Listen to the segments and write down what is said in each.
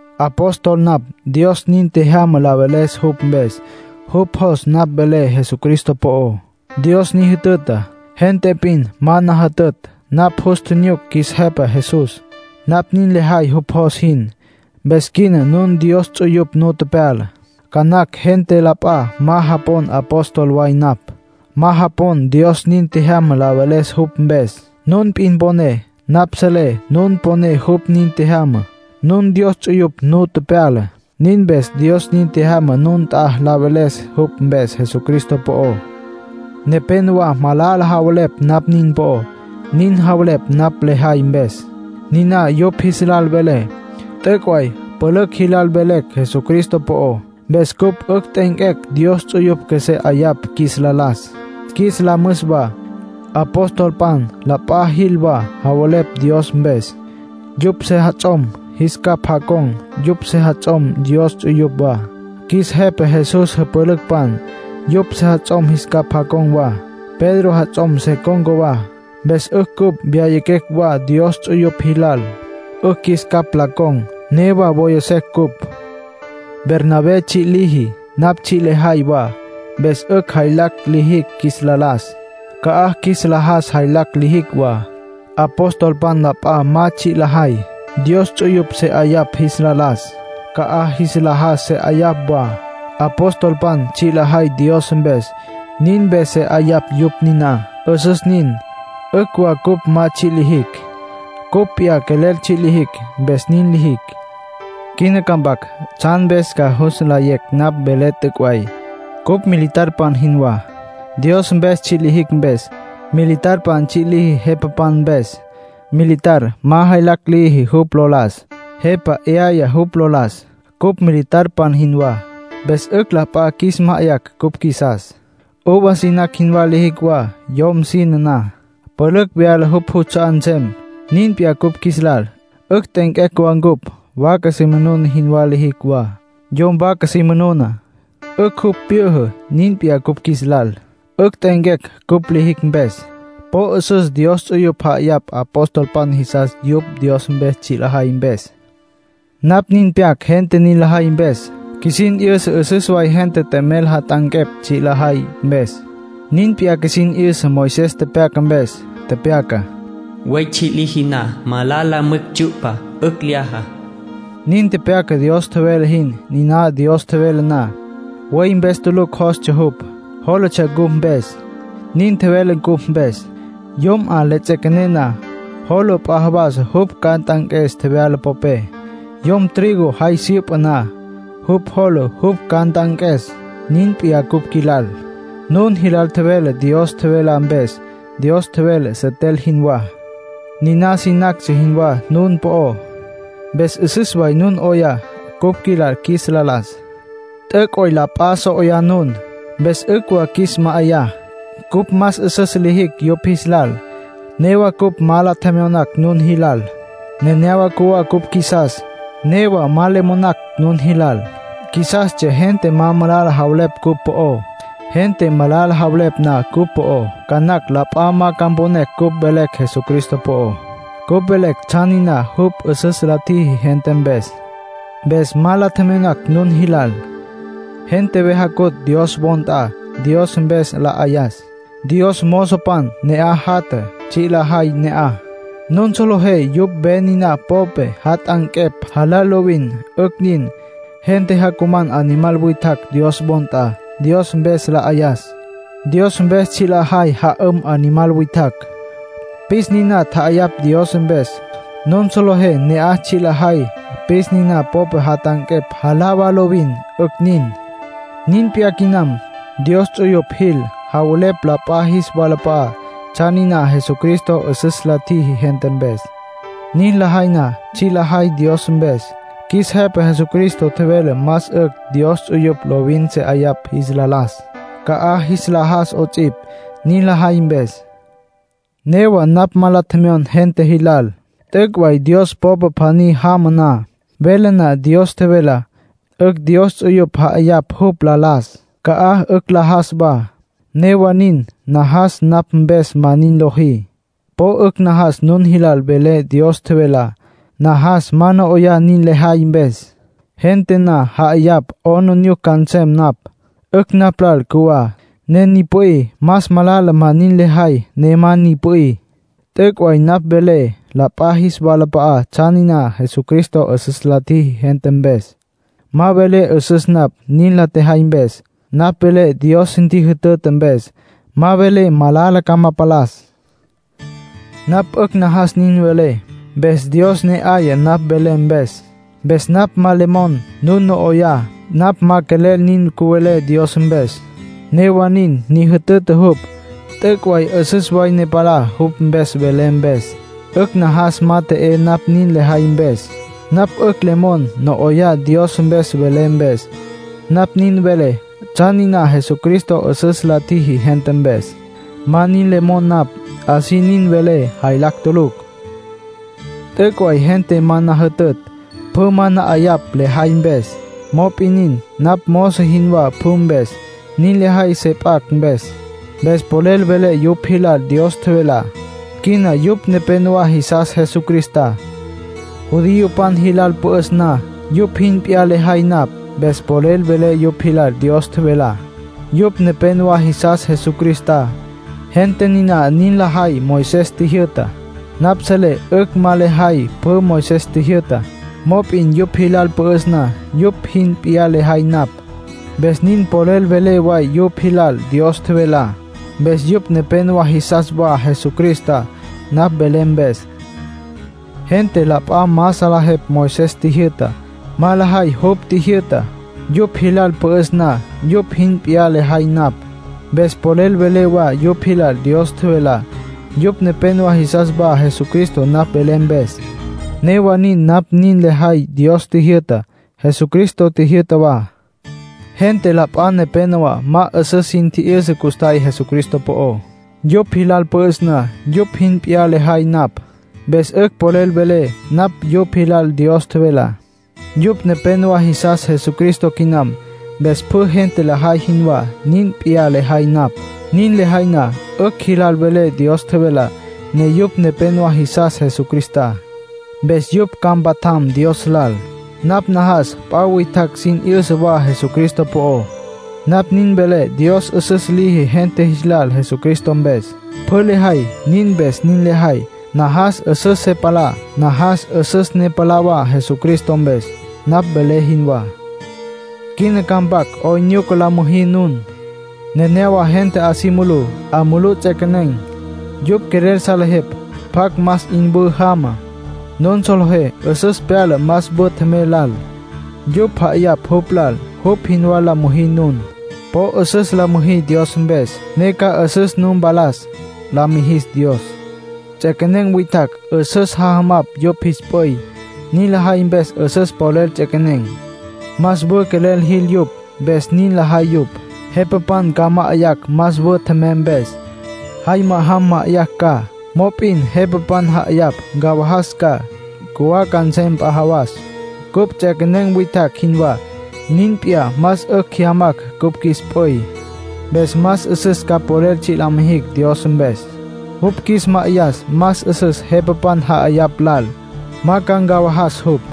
Apóstol napj. Dios nin tjejyama la veles jupj mpes. Jupj jos napj velé Jesucristo po'ó. Dios ni jütüta. Gente p'in ma na jütütj. Napj jus tjinyuc qjuis Jepa Jesús. Napj nin lejay jupj jos jin. Mpes quina nun Dios ts'uyupj nu tepyala. Ca nacj gente la p'a ma japon apóstol way napj, ma japon Dios nin tjejyama la veles jupj mpes. Nun p'in poné. Napj selé nun poné jupj nin tjejyama. Nun Dios ts'uyupj nu tepyala. Nin mpes Dios nin tjejyama nun nt'a la veles jupj mpes Jesucristo po'ó. Nepénowa malala javelepj napj nin po'ó. Nin javelepj napj lejay mpes. Niná yupj jis lal velé. T'üc' way pülücj jilal velecj Jesucristo po'ó. Mpes cupj 'ücj t'e'enquecj Dios ts'uyupj qjuesé 'ayapj qjuis la las, qjuis la müs wa. Apostolpan la p'a jil wa, javelepj Dios mpes. Yupj sejats'om jis capj jacon̈. Yupj sejats'om Dios ts'uyupj wa. Qjuis Jepa Jesús jüpülücpan, yupj sejats'om jis capj jacon̈ wa. Pedro jats'om se con̈ca wa. Mpes 'ücj cupj wyayaquecj wa Dios ts'uyupj jilal, 'ücj qjuis capj la con̈. Newa woya secj cupj. Bernabé tsji' liji, napj tsji' lejay wa, mpes 'ücj jaylacj lijicj qjuis la las, ca'aj qjuis la jas jaylacj lijicj wa. Apostolpan la p'a ma tsji' lajay. Dios ts'uyupj se 'ayapj jis la las, ca'aj jis la jas se 'ayapj wa. Apostolpan tsji' lajay Dios mpes; nin mpes se 'ayapj yupj niná. 'Üsüs nin. 'Ücj wa cupj ma tsji' lijicj; cupj p'iyá quelel tsji' lijicj, mpes nin lijicj. Quina ca mpac tsjan mpes ca jus nlayé napj velé t'üc' way. Cupj militarpan jinwá, Dios mpes tsji' lijicj mpes. Militar tsji' liji jepapan mpes. Militar ma jaylacj liji jupj lo las. Jepa 'yaya jupj lo las. Cupj militarpan jinwá, mpes 'ücj la p'a ca qjuis ma'ayacj cupj qjuisas. Uva sinacj jinwá lijicj wa. Yom sine na, pülücj vyala jupj juts'a'á nsem. Nin p'iyá cupj qjuis lal; 'ücj t'e'enquecj wa cupj. Vaca si manuna jinwá lijicj wa. Yom vaca si manuna, 'ücj jupj pjyüjü. Nin p'iyá cupj qjuis lal; 'ücj t'e'enquecj cupj lijicj mpes. Po 'üsüs Dios ts'uyupj ja'ayapj apostolpan jisas yupj Dios mpes tsji' lajay mpes. Napj nin pyac gente nin lajay mpes. Qjuisin 'yüsa 'üsüs way gente t'emel jat'anquepj tsji' la tjajay mpes. Nin p'iyá qjuisin 'yüsa Moisés tepyaca mpes. Tepyaca: “Buey tsji' liji na, malala mwicj tsyu'pa. 'Ücj lyaja.” Nin tepyaca Dios tjevele jin. Niná Dios tjevele na, buey mpes tulucj jólatsja jupj. Jólatsja cupj mpes. Nin tjevele cupj mpes. Yom 'amá le tsjequé na, jola p'a jawas jupj ca nt'anques tjevyala popé. Yom trigo jay syüpa na, jupj jola jupj ca nt'anques. Nin p'iyá cupj qjuilal. Nun jilal tjevelecj Dios tjevelá mpes. Dios tjevele, setel jinwá. Niná sinactsja jinwá nun po'ó. Mpes 'üsüs way nun 'oyá cupj qjuilal qjuis la las. T'üc' way la p'a so 'oyá nun. Mpes 'ücj wa qjuis ma'ayá. Cupj más 'üsüs la tjijicj yupj jis lal. Newa cupj ma la tjemyonacj nun jilal. Nenéyawa cjuwá cupj qjuisas. Newa ma le monacj nun jilal; qjuisastsja gente ma malala javelepj cupj po'ó. Gente malala javelepj na cupj po'ó, ca nacj la p'a ma ca mponecj cupj velecj Jesucristo po'ó. Cupj velecj tsjan niná jupj 'üsüs la tjiji gente mpes. Mpes ma la tjemyonacj nun jilal. Gente ve jacutj Dios wo nt'a, Dios mpes la 'ayas. Dios mozopan ne'aj jatja, tsji' lajay ne'aj. Nun solejé yupj ve niná popé jat'anquepj, jalá lovin. 'Ücj nin. Gente jacuman animal witjacj Dios wo nt'a, Dios mpes la 'ayas. Dios mpes tsji' lajay ja'üm animal witjacj. Pis niná tja'ayapj Dios mpes. Nun solejé ne'aj tsji' lajay pis niná popé jat'anquepj, jalá wa lovin. 'Ücj nin. Nin p'iyá quinam. Dios ts'uyupj jil, javelepj la p'a jis walap'a'á tsjan niná Jesucristo 'üsüs la tjiji gente mpes. Nin lajay na, tsji' lajay Dios mpes. Qjuis Jepa Jesucristo tjevele más 'ücj Dios ts'uyupj lovin se 'ayapj jis la las, ca'aj jis la jas 'ots'ipj, niná lajay mpes. Newa napj ma la tjemyon gente jilal. T'üc' way Dios popa pjaní jama na, vele na Dios tjevelá, 'ücj Dios ts'uyupj ja'ayapj jupj la las, ca'aj 'ücj la jas wa. Newa nin, najas napj mpes ma nin lojí. Po 'ücj najas nun jilal velé Dios tjevelá. Najas ma no 'oyá nin lejay mpes. Gente na 'ayapj, 'aplijila ca nsem napj. 'Ücj napj lal cjuwá, ne ni pü'í. Más malala ma nin lejay, ne ma ni pü'í. T'üc' way napj velé la p'a jis walap'a'á tsjan niná Jesucristo 'üsüs la tjiji gente mpes. Ma velé 'üsüs napj, nin la tjejay mpes. Napj velé Dios ntjijütüta mpes. Ma velé, malala ca ma palas. Napj 'ücj najas nin velé, mpes Dios ne 'aya napj velé mpes. Mpes napj ma le mon nun no 'oyá. Napj ma quelel nin cüvelé Dios mpes, newa nin ni jütüta jupj. T'üc' way 'üsüs way ne palá jupj mpes velé mpes. 'Ücj najas ma t'e'é napj nin lejay mpes. Napj 'ücj le mon no 'oyá Dios mpes velé mpes. Napj nin velé tsjan niná Jesucristo 'üsüs la tjiji gente mpes. Ma nin le mon napj. Así nin velé, jaylacj tulucj. T'üc' way gente ma na jütütj. Pjü ma na 'ayapj lejay mpes. Mop'in nin, napj mozo jinwá pjü mpes. Nin lejay se p'acj mpes. Mpes polel velé yupj jilal Dios tjevelá. Quina yupj nepénowa jisas Jesucristá. Judiopan jilal pü'üs na, yupj jin p'iyá lejay napj. Mpes polel velé yupj jilal Dios tjevelá. Yupj nepénowa jisas Jesucristá. Gente niná nin lajay Moisés tjijyü'tá. Napj selé 'ücj ma lejay pjü Moisés tjijyü'tá. Mop'in yupj jilal pü'üs na, yupj jin p'iyá lejay napj. Mpes nin polel velé wa yupj jilal Dios tjevelá. Mpes yupj nepénowa jisas wa Jesucristá napj velé mpes. Gente la p'a ma salejepj Moisés tjijyü'tá, ma lajay jupj tjijyü'tá. Yupj jilal pü'üs na, yupj jin p'iyá lejay napj. Mpes polel velé wa yupj jilal Dios tjevelá. Yupj nepénowa jisas wa Jesucristá napj velé mpes. Newa nin napj nin lejay Dios tjijyü'tá, Jesucristo tjijyü'ta wa. Gente la p'a nepénowa ma 'üsüs sin tji'yüsa custjay Jesucristo po'ó. Yupj jilal pü'üs na, yupj jin p'iyá lejay napj. Mpes 'ücj polel velé napj yupj jilal Dios tjevelá. Yupj nepénowa jisas Jesucristo quinam. Mpes pjü gente lajay jinwá, nin p'iyá lejay napj. Nin lejay na, 'ücj jilal velé Dios tjevelá, ne yupj nepénowa jisas Jesucristá. Mpes yupj ca mpatjam Dios lal. Napj najas p'a witjacj sin 'yüsa wa Jesucristo po'ó. Napj nin velé Dios 'üsüs liji gente jis lal Jesucristo mpes. Pjü lejay, nin mpes nin lejay. Najas 'üsüs se palá, najas 'üsüs ne palá wa Jesucristo mpes, napj velé jinwá. Quina ca mpac 'oyn nyuca la müjí nun. Nenéyawa gente 'a si mulú, 'a mulú ts'equenen̈. Yupj quelel salejepj pjacj más 'in wü jama. Nun solejé 'üsüs pyala más wü tjemey lal. Yupj ja'ayapj jupj lal. Jupj jinwá la müjí nun. Po 'üsüs la müjí Dios mpes, ne ca 'üsüs nu mpalas, la mijis Dios. Ts'equenen̈ witjacj 'üsüs jajamapj yupj jis p'üy. Nin lajay mpes 'üsüs polel ts'equenen̈. Más wü quelel jil yupj, mpes nin lajay yupj. Jepapan ca ma'ayacj más wü tjemey mpes, jay ma'ajam ma'ayacj ca. Mop'in jepapan ja'ayapj ncawajas ca, cjuwá nsem p'a jawas. Cupj ts'equenen̈ witjacj jinwá. Nin p'iyá más 'ücj jyamacj cupj qjuis p'üy. Mpes más 'üsüs ca polel tsji' la mijicj Dios mpes. Jupj qjuis ma'ayas más 'üsüs jepapan ja'ayapj lal; ma ca ncawajas jupj.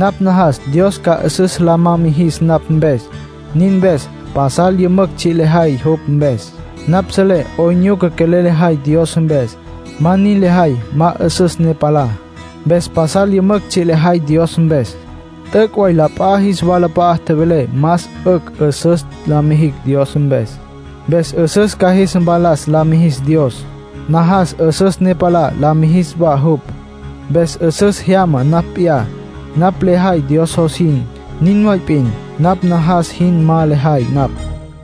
Napj najas Dios ca 'üsüs la ma jis napj mpes; nin mpes pasal yümücj tsji' lejay jupj mpes. Napj selé 'oyn nyuca quelel lejay Dios mpes. Ma nin lejay, ma 'üsüs ne palá. Mpes pasal yümücj tsji' lejay Dios mpes. T'üc' way la p'a jis walap'a'a tjevelé más 'ücj 'üsüs la mijicj Dios mpes. Mpes 'üsüs ca jis mpalas, la mijis Dios. Najas 'üsüs ne palá la mijis wa jupj. Mpes 'üsüs jyamá napj p'iyá. Napj lejay Dios jos jin, nin way p'in. Napj najas jin ma lejay napj.